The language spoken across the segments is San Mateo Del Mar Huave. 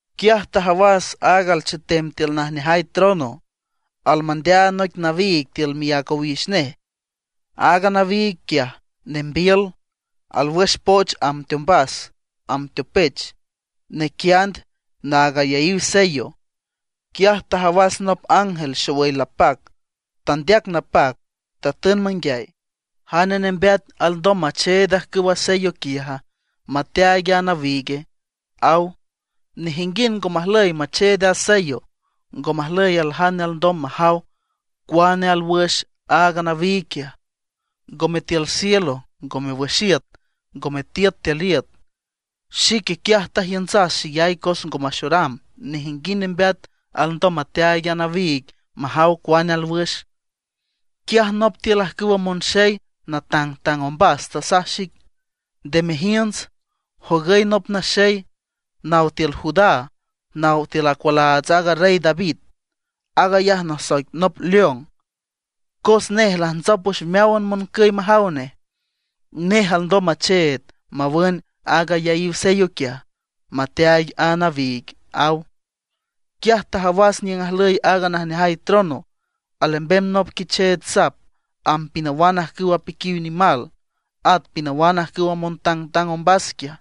Quiaj tajawas aaga alchetem tiül najneajay trono, almandeaand noic nawiig tiül miác owix nej. Aaga nawiig quiaj nembiül, alwüx poch amb teombas amb teopech, naquiand naag ayaíw sello. Quiaj tajawas nop ángel xowüy lapac, tandeac napac, tatün manguiay: ―¿Jane nembeata, alndom macheed ajcüwa sello quiaja, mateaaig a nawiigue? ―aw. Nejinguind ngo majlüy macheed a sello; ngo majlüy aljane alndom majaw cuane alwüx aaga nawiig quiaj, ngome tiül cielo, ngome wüx iüt, ngome tiüt tiül iüt. Xique quiaj tajiüntsas xeyay cos ngo maxoram nejinguind nembeat alndom mateaaig a nawiig majaw cuane alwüx. Quiaj nop tiül ajcüwa monxey natangtang ombas tasaj xic: ―Nde mejiünts, jogüy nop naxey naw tiül Judá, naw tiül acualaats aaga Rey David. Aag ayaj nasoic nop león, cos nej lajntsop wüx meáwan moncüy majaw nej. Nej alndom macheed mawün aaga ayaíw sello quiaj, mateaaig a nawiig ―aw. Quiaj tajawas niüng ajlüy aaga najneajay trono, alembem nop Quicheech Sap amb pinawan ajcüw apiquiw nimal, at pinawan ajcüw montangtang ombas quiaj.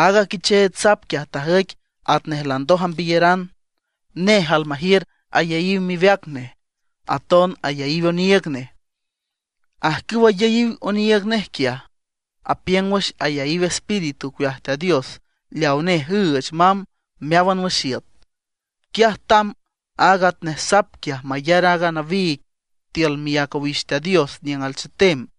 Aaga Quicheech Sap quiaj tajüic atnej landoj ambiyeran. Nej almajiür ayaíw miweac nej, aton ayaíw oniiüg nej. Ajcüw ayaíw oniiüg nej quiaj, apiüng wüx ayaíw espíritu ocueaj Teat Dios leaw Nej üüch mamb meáwan wüx iüt. Quiaj tamb aaga atnej Sap quiaj mayar a nawiig tiül miác owix Teat Dios niüng alchetem.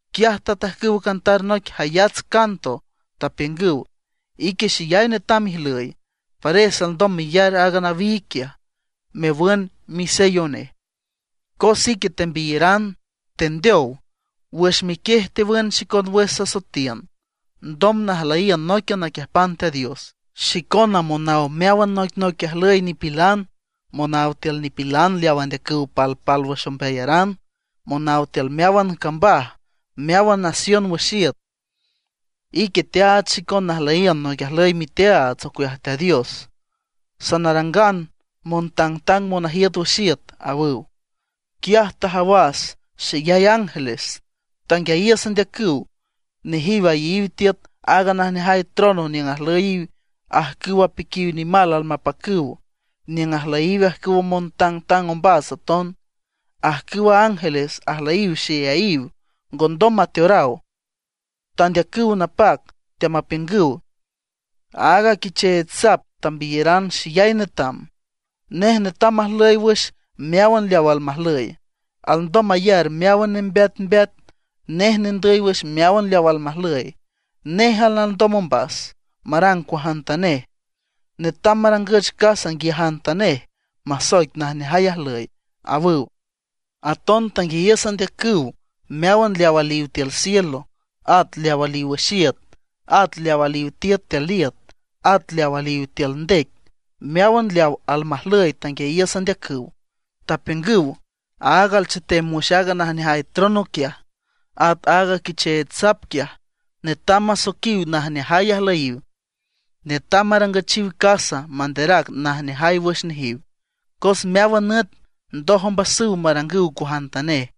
Quiaj tatajcüw cantar noic jayats canto, tapiüngüw: Ique xeyay netam ijlüy, pares alndom meyar aaga nawiig quiaj, mewün misello nej, cos ique tembiyeran, tendeow. Wüx miquiej tewün xicon wüx sasoetiün ndom najlüyiün nóiquian naquiiüjpan Teat Dios. Xicona monaw meáwan noicnoic ajlüy nipilan; monaw tiül nipilan leaw andeacüw palpálwüx ombeayaran; monaw tiül meáwan cambaj, meáwan nación wüx iüt. Ique teaach xicon najlüyiün noic ajlüy miteaats ocueaj Teat Dios; sanarangan montangtang monajiüt wüx iüt, awüw. Quiaj tajawas xeyay ángeles, tanguiayiüs andeacüw. Nejiw ayeyiw tiüt aaga najneajay trono niüng ajlüyiw ajcüw apiquiw nimal almapacüw; niüng ajlüyiw ajcüwa montangtang ombas aton. Ajcüwa ángeles ajlüyiw xeyayiw, ngondom mateoraw. Teandeacüw napac, teamapiüngüw: Aaga Quicheech Sap tambiyaran xeyay netam, nej netam majlüy wüx meáwan leaw almajlüy, alndom mayar meáwan nembeatmbeat, nej nendüy wüx meáwan leaw almajlüy; néjan alndom ombas marang cuajantanej, netam marangüch casa nguiajantanej, masoic najneajay ajlüy, awüw. Aton tanguiayiüs andeacüw meáwan leaw aliw tiül cielo, at leaw aliw wüx iüt, at leaw aliw tiüt tiül iüt, at leaw aliw tiül ndec. Meáwan leaw almajlüy tanguiayiüs andeacüw, tapiüngüw: Aaga alchetem wüx aaga najneajay trono quiaj, at aaga Quicheech Sap quiaj, netam masoiquiw najneajay ajlüyiw. Netam marangüchiw casa, manderac najneajay wüx nejiw, cos meáwan nüt ndoj ombasüw marangüw cuajantanej.